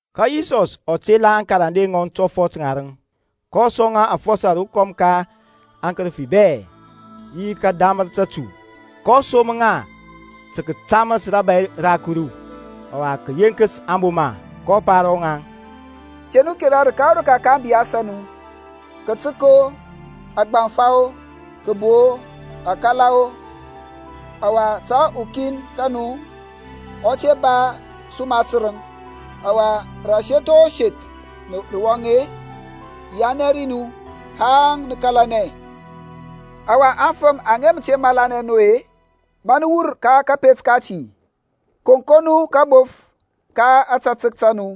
Ka Yisɔs ɔ tela aŋkarande ŋɔŋ tɔfɔt ŋarəŋ, kɔ sɔŋ ŋa afɔsɔ rokɔm ka akərəfi bɛ, yi tə kədamər tətu. kɔ som ŋa tə kətaməs rȧbȧy ra Kuru, ɔwa, tə kəyeŋkəs aŋboma. kɔ pa ro ŋaŋ, Te nu kera rəka o rəka ka ȧŋbiyas a nu, kətək-o, agbaŋfa-o, kəbo-o, akala-o; ɔwa ta ukin ka nu ɔ te ba suma tərəŋ. Ɔwa rə aseth o seth nə wɔŋ-e, yianɛ ri nu haŋ nə kȧlanɛ. Ɔwa aŋfəm aŋa mə te malanɛ nu-e, ma nə wur ka kȧpet kati, koŋkoŋ nu kabof ka ȧtȧtək ta nu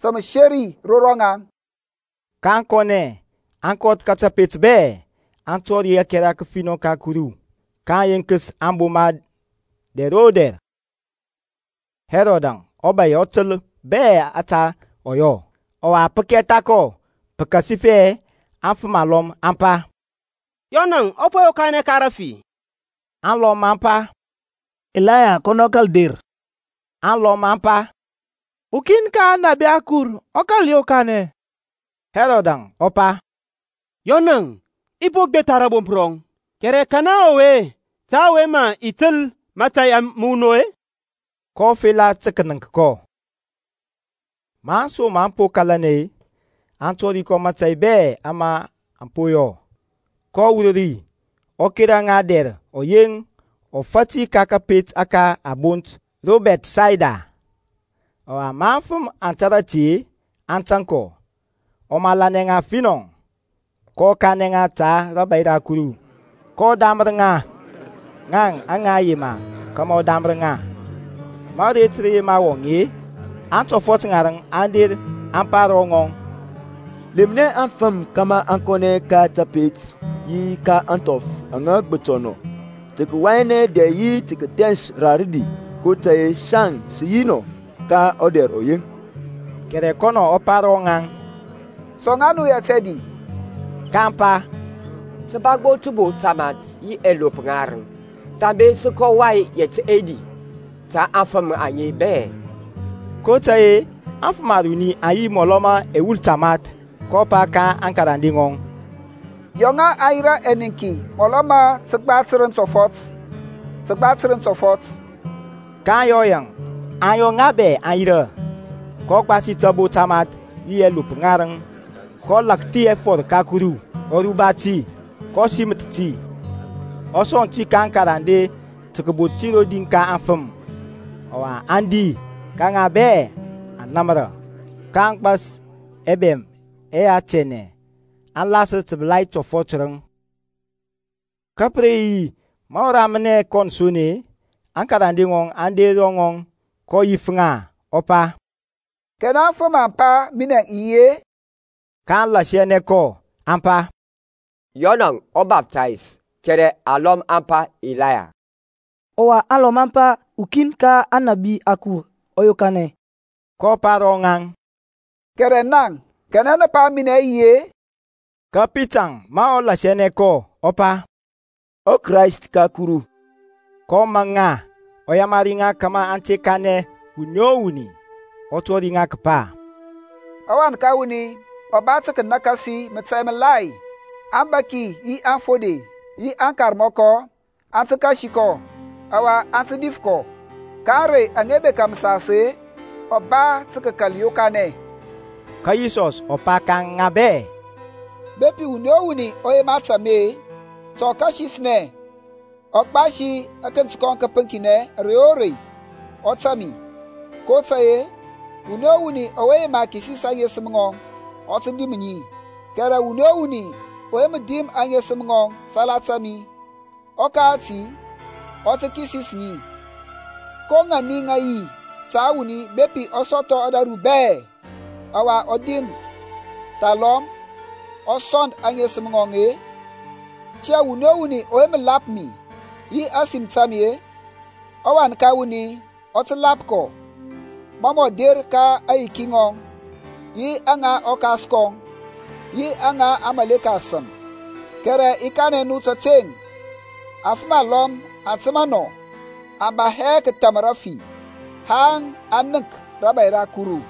ta məseri ro rɔŋaŋ. kaŋ kɔnɛ, aŋ kɔth ka tapet bɛ, aŋ tɔri ȧkɛra kəfinɔ ka Kuru, kaŋ yenkəs aŋboma dɛr o dɛr. Hɛrɔdȧŋ ɔbȧy ɔ təl bɛ ȧte ɔ yɔ, ɔwa pə kɛtha kɔ pəkasifɛ afəm alɔm aŋ pa, Yɔnȧŋ ɔ po yokanɛ ka rafi. Alɔm aŋ pa, Ilaya kɔnɔ kȧl der; alɔm aŋ pa, Ukin ka aŋnabi akur ɔ kȧl yokanɛ. Hɛrɔdȧŋ ɔ pa, Yɔnȧŋ i po gbetha rȧbomp rɔŋ, kɛrɛ kanɛ ɔwe ta ɔwe mə i təl mȧtȧy məwunɔŋ-e? Kɔ fela tə kənəŋk kɔ. Ma aŋsom aŋ po kalanɛ-e, aŋ tɔri kɔ mȧtȧy bɛ ama aŋ po yɔ. Kɔ wur ri ɔ kera ŋa dɛr ɔyeŋ ɔfati ka kȧpet ȧke a bont ro Bɛthsayda. Ɔwa ma aŋfəm aŋ tȧrȧ ti-e, aŋ tȧŋ kɔ. Ɔ malanɛ ŋa finɔ, kɔ kanɛ ŋa ta rȧbȧy ra Kuru, kɔ damər ŋaŋ aŋa yema kȧmȧ ɔ damər ŋa. Ma aret rə yema wɔŋ-e, aŋtɔfɔt ŋarəŋ aŋ der aŋ pa ro ŋɔŋ, Lemnɛ aŋfəm kȧmȧ aŋ kɔnɛ ka tapet yi ka ȧŋthɔf aŋa gbətɔ nɔ tə kəyianɛ dɛ yi tə kəthɛns ra rədi, kotȧy-e saŋ sə yi nɔ ka ɔdɛr ɔyeŋ. Kɛrɛ kɔnɔ ɔ pa ro rɔŋaŋ. Sɔŋ ŋa nu yɛt ɛdi. Kaŋ pa, Sə ba gbo təbo tamath yi ɛlop ŋarəŋ; thambe sə kɔ wai yɛt ɛdi ta aŋfəm aŋe bɛ. kotȧy-e aŋfəm aruni aŋ yi mɔlɔ ma ɛwul tamath. Kɔ pa ka aŋkarande ŋɔŋ, Yɔ ŋa aŋ yirȧ ɛniŋki mɔlɔ ma təgba tərəŋ tɔfɔt, təgba tərəŋ tɔfɔt. kaŋ yɔ yaŋ, aŋ yɔ ŋa bɛ aŋ yirȧ. kɔ gbasi tabo tamath yi ɛlop ŋarəŋ, kɔ lakthi ɛfɔr ka Kuru, ɔ ruba ti, kɔ siməth ti, ɔ sɔŋ ti ka aŋkarande tə kəbot ti rodi ka aŋfəm. Ɔwa aŋ di, ka ŋa bɛ aŋ namra. Ka a gbas ɛbɛm ɛyɛ tianɛ, a lasər təbəlai tɔfɔt tərəŋ. Ka pə re yi ma ɔ ramnɛ kɔn son-e, aŋkarande ŋɔŋ aŋ der ro ŋɔŋ, kɔ yif ŋa, ɔ pa, Kanɛ aŋfəm mə aŋ pa minɛ i yi-e? kaŋ lasianɛ kɔ, aŋ pa, Yɔn ɔbaptist, kɛrɛ alɔm aŋ pa, Ilaya; ɔwa alɔm aŋ pa, Ukin ka aŋnabi akur ɔ yokanɛ. kɔ pa ro rɔŋaŋ, Kɛrɛ naŋ, kanɛ nə pa minɛ i yi-e? Ka Pitaŋ ma ɔ lasianɛ kɔ ɔ pa, ƆKrayst ka Kuru. kɔ maŋ ŋa, ɔ yamari ŋa kȧmȧ aŋ te kanɛ wuni o wuni; ɔ tɔri ŋa kəpa ɔWan ka wuni ɔ ba tə kənakasi mȧtȧy məlai, aŋbȧki yi aŋfode yi aŋkarmɔkɔ aŋ tə kasi kɔ, ɔwa a tə dif kɔ. Ka ȧŋrey aŋa bekȧ məsas-e ɔ ba tə kəkal yokanɛ. Ka Yisɔs ɔ pa ka ŋa bɛ, Bepi wuni o wuni ɔ yema tȧŋ mi-e, ta ɔ kasisnɛ, ɔ gbasi akənt kɔŋ kəpəŋkinɛ ȧrey o rei, ɔ tȧŋ mi. kotȧy-e wuni o wuni ɔwe yema kisis aŋesəm ŋɔŋ, ɔ tə dim ŋi; kɛrɛ wuni o wuni ɔwe mə dim aŋesəm ŋɔŋ salata minɛ, ɔkati ɔ tə kisis ŋi. Ko ŋani aŋ yi ta wuni bepi ɔ sɔthɔ ȧdȧru bɛ, ɔwa ɔ dim thalɔm ɔ sɔnd aŋesəm ŋɔŋ-e? Tiyȧŋ wuni o wuni ɔwe mə lap mi yi ȧsim ta mi-e, ɔWan ka wuni ɔ tə lap kɔ ma mɔ der ka aŋyiki ŋɔŋ, yi aŋa ɔKas kɔŋ, yi aŋa aŋmȧleka asəm. Kɛrɛ i kanɛ nu təteŋ, afəm alɔm aŋ təmȧ nɔ, aŋ ba hɛ kətham rəfi haŋ aŋ nənk rȧbȧy ra Kuru.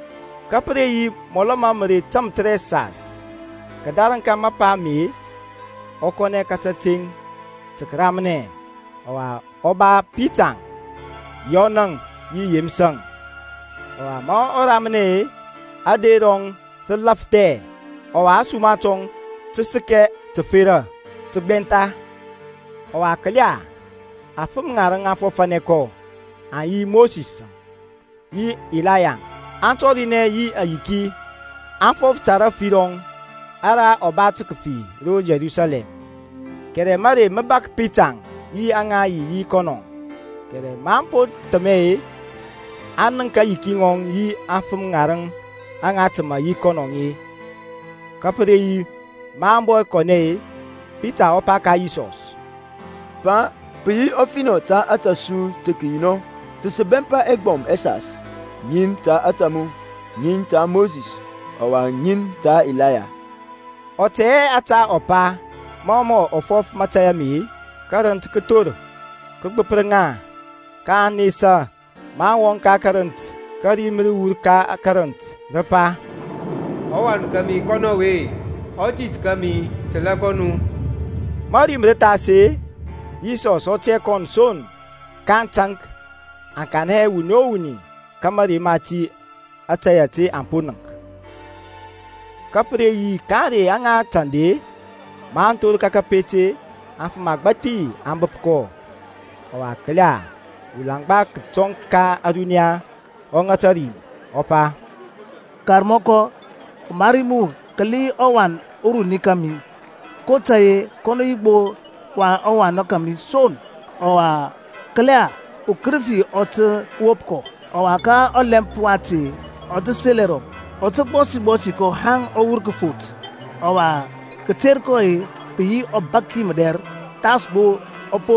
Ka pə re yi mɔlɔ ma mərey tamthərɛsas kədarəŋ ka mapa ame, ɔ kɔnɛ ka kateŋ tə kəramnɛ, ɔwa ɔ ba Pitaŋ, Yɔnȧŋ yi Yeməsȧŋ. Ɔwa ma ɔ ramnɛ-e, ader rɔŋ rə lafthɛ, ɔwa ȧsuma tɔŋ tə səkɛ təfera təgbɛntha. Ɔwa kəla, afəm ŋarəŋ aŋ fɔfȧnɛ kɔ, aŋ yi Mosisȧŋ yi Ilayaŋ. Aŋ tɔrinɛ yi ayiki, aŋ fɔf ta rafi rɔŋ ara ɔ ba tə kəfi ro Yerusalɛm. Kɛrɛ mərey mə bȧk Pitaŋ yi aŋa yi yi kɔnɔ; kɛrɛ maŋ po thəmɛ-e, aŋ nənk aŋyiki ŋɔŋ yi aŋfəm ŋarəŋ aŋa təmȧ yi kɔnɔŋ-e. Ka pə re yi maŋ bɔ kɔnɛ-e Pita ɔ pa ka Yisɔsȧŋ, Pa, pə yi ɔfinɔ ta ȧtȧ su tə kəyi nɔ; ta sə bɛmpa ɛgbɔm ɛsas, ŋin ta ȧtȧ mu, ŋin ta Mosis, ɔwa ŋin ta Ilaya; ɔ tɛ hɛ ȧte ɔ pa. Mɔ mɔ fɔf mȧtȧy ame-e, kərənt kə thor, kə gbəpər ŋa, kaŋ nesa maŋ wɔŋ ka karənt. Ka rim rə wur ka karənt, rə pa, ƆWan kȧmi kɔnɔ ɔwe, ɔthith kȧmi. Təla kɔ nu. Ma ȧrim rə thas-e, Yisɔsȧŋ ɔ tiyȧ kɔn son. Ka aŋ taŋk, aŋ kanɛ hɛ wuni o wuni ka mȧrey mati ta ȧtȧy ȧte aŋ po nənk. Ka pə re yi ka ȧŋrey aŋa tanda-e, maŋ thor ka kateŋ-e, afəm agbȧthi aŋ bəp kɔ. Ɔwa kəla, ulaŋgba kətɔŋ ka ȧruniya ɔ ŋata rim, ɔ pa, Karmɔkɔ, ɔmari mu kəli ɔwan uruni kȧmi; kotȧy-e kɔnɔ yi ɔwan kȧmi gbo son. Ɔwa kəla, ukərəfi ɔ tə wop kɔ, ɔwa ka ɔlɛmp wati ɔ tə sel ɛrɔŋ; ɔ tə gbɔsi gbɔsi kɔ haŋ ɔ wur kəfoth, ɔwa kəter kɔ pə yi ɔbaki mədɛr thas gbo ɔ po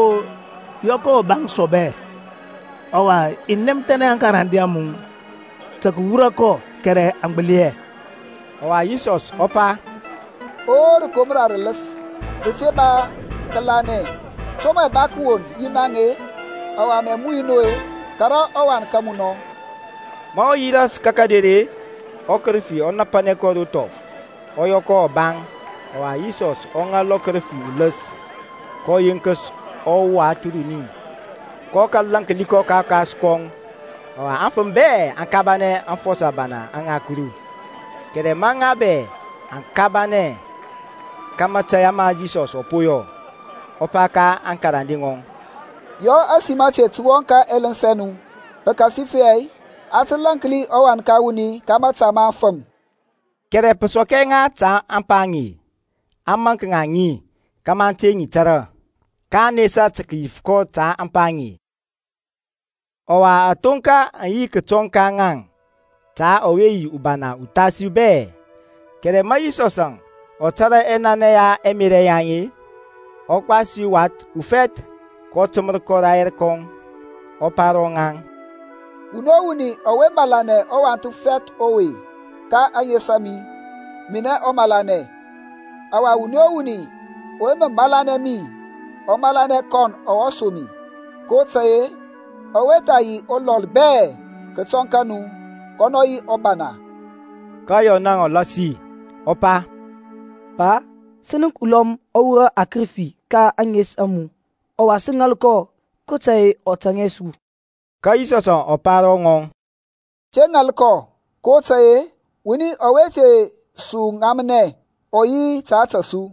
yɔ kɔ ɔbaŋ sɔbɛ. Ɔwa i nɛmthɛnɛ aŋkarande a mu tə kəwura kɔ, kɛrɛ aŋ gbəli hɛ. Ɔwa Yisɔs ɔ pa, O rəkomra rələs rəte ba kȧlanɛ, to mɛ i ba kəwon yi naŋ-e, ɔwa i muyu nu-e? Kara ɔwan ka mu nɔ. Ma ɔ yi ras ka kəder-e, ɔkərəfi ɔ napanɛ kɔ ro thɔf, ɔ yɔ kɔ ɔbaŋ. Ɔwa Yisɔs ɔ ŋal ɔkərəfi uləs, kɔ yenkəs ɔwath uruni, kɔ kȧl lȧnki kɔ ka ɔkas kɔŋ. Ɔwa afəm bɛ aŋ kabanɛ aŋfɔsɔ abana ŋa Kuru. Kɛrɛ ma ŋa bɛ aŋ kabanɛ ka mȧtȧy ama Yisɔs ɔ po yɔ, ɔ pa ka aŋkarande ŋɔŋ, Yɔ ȧsim ȧte tə wɔŋ ka ɛləns ɛ nu, pəkasifɛ a tə lȧnki ɔWan ka wuni ka mȧta ma aŋfəm. Kɛrɛ pə sɔk hɛ ŋa ta ȧŋpa aŋe, a maŋk ŋa ŋi kȧmȧ aŋ te ŋi tȧrȧ. Kaŋ nesa tə kəyif kɔ ta ȧŋpa aŋe. Ɔwa ȧthonka aŋ bɔ yi kətɔŋ ka ŋaŋ ta ɔwe yi ubana uthasi bɛ. Kɛrɛ ma Yisɔsȧŋ ɔ tȧrȧ ɛnanɛ ya ɛmerȧ yaŋ-e, ɔ gbasi wath ufɛth, kɔ təmər kɔ rayɛr kɔŋ, ɔ pa ro rɔŋaŋ, Wuni o wuni ɔwe malanɛ ɔwath ufɛth ɔwe ka ȧŋes a mi, minɛŋ ɔ malanɛ; ɔwa wuni o wuni ɔwe mə malanɛ mi ɔ malanɛ kɔn ɔwe som mi, kotȧy-e ɔwe tha yi ulɔl bɛ kətɔŋ ka nu, kɔnɔ yi ubana. Ka Yɔnȧŋ ɔ lasi ɔ pa, Pa, sə nənk ulɔm ɔ wurɔ akərəfi ka ȧŋes a mu, ɔwa sə ŋal kɔ kotȧy-e ɔ tȧŋ hɛ su. Ka Yisɔsȧŋ ɔ pa ro ŋɔŋ, Te ŋal kɔ, kotȧy-e wuni ɔwe te su ŋamnɛ, ɔ yi ta ȧtȧ su.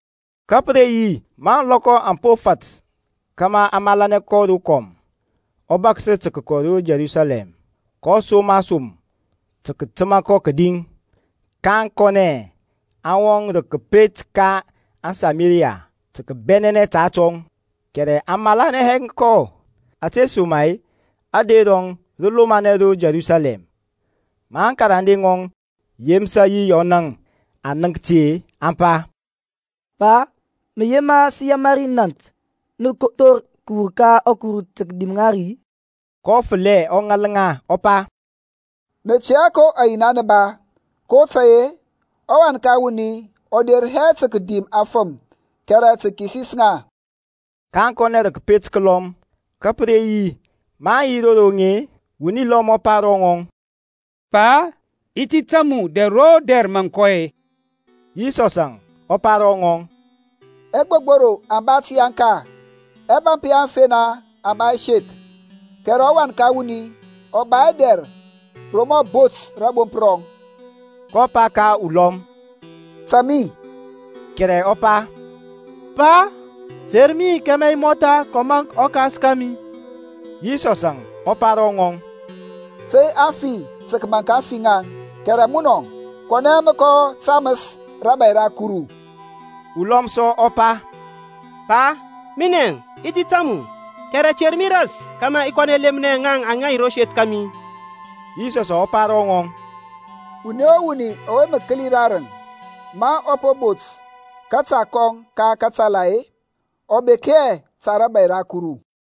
Ka pə re yi ma ȧŋlɔkɔ aŋ po fat kȧmȧ a malanɛ kɔ rokɔm, ɔ bȧksər tə kəkɔ ro Yerusalɛm. kɔ som asom tə kətəma kɔ kədi, kaŋ kɔnɛ, aŋ wɔŋ rə kəpet ka aŋSameriya tə kəbɛnɛnɛ ta atɔŋ. Kɛrɛ aŋ malanɛ hɛ kɔ ȧtesoma-e ader rɔŋ rə lomanɛ ro Yerusalɛm. Ma aŋkarande ŋɔŋ Yeməsȧŋ yi Yɔnȧŋ aŋ nənk ti-e, aŋ pa, Pa, mə yema sə yamari nȧnt nə thor kəwur ka ȧkuru tə kədim ŋa ri-i? kɔ fəlɛ ɔ ŋal ŋa, ɔ pa, Nə tɛ hɛ ko ayina nə ba, kotȧy-e ɔWan ka wuni ɔ der hɛ tə kədim afəm kɛrɛ tə kəkisis ŋa. Kaŋ kɔnɛ rə kəpet kəlɔm. Ka pə re yi maŋ yi ro roŋ-e, wuni lɔm ɔ pa ro ŋɔŋ, Pa, i ti tȧŋ mu dɛr o dɛr mȧ mə kɔ. Yisɔsȧŋ ɔ pa ro ŋɔŋ, Ɛgbogboro aŋ ba təyaŋka, ɛbȧmp ya aŋfena aŋ ba ɛseth, kɛrɛ ɔWan ka wuni ɔ ba hɛ dɛr ro mɔ bot rȧbomp rɔŋ. kɔ pa ka ulɔm, Tȧŋ mi, kɛrɛ ɔ pa, Pa, ter mi kȧmȧ i mɔtha kɔ maŋk ɔkas kȧmi. Yisɔsȧŋ ɔ pa ro ŋɔŋ, Tey aŋfi tə kəmȧnk ȧŋfi ŋaŋ, kɛrɛ munɔŋ, kɔnɛ mə kɔ taməs rȧbȧy ra Kuru. Ulɔm sɔ ɔ pa, Pa, minɛ i ti tȧŋ mu, kɛrɛ ter mi ras kȧmȧ i kɔ lemnɛ ŋaŋ aŋa yi ro seth kȧmi. Yisɔsȧŋ ɔ pa ro ŋɔŋ, Wuni o wuni ɔwe mə kəli rarəŋ ma ɔ po bot kȧta kɔŋ ka katala-e, ɔ bek hɛ ta rȧbȧy ra Kuru.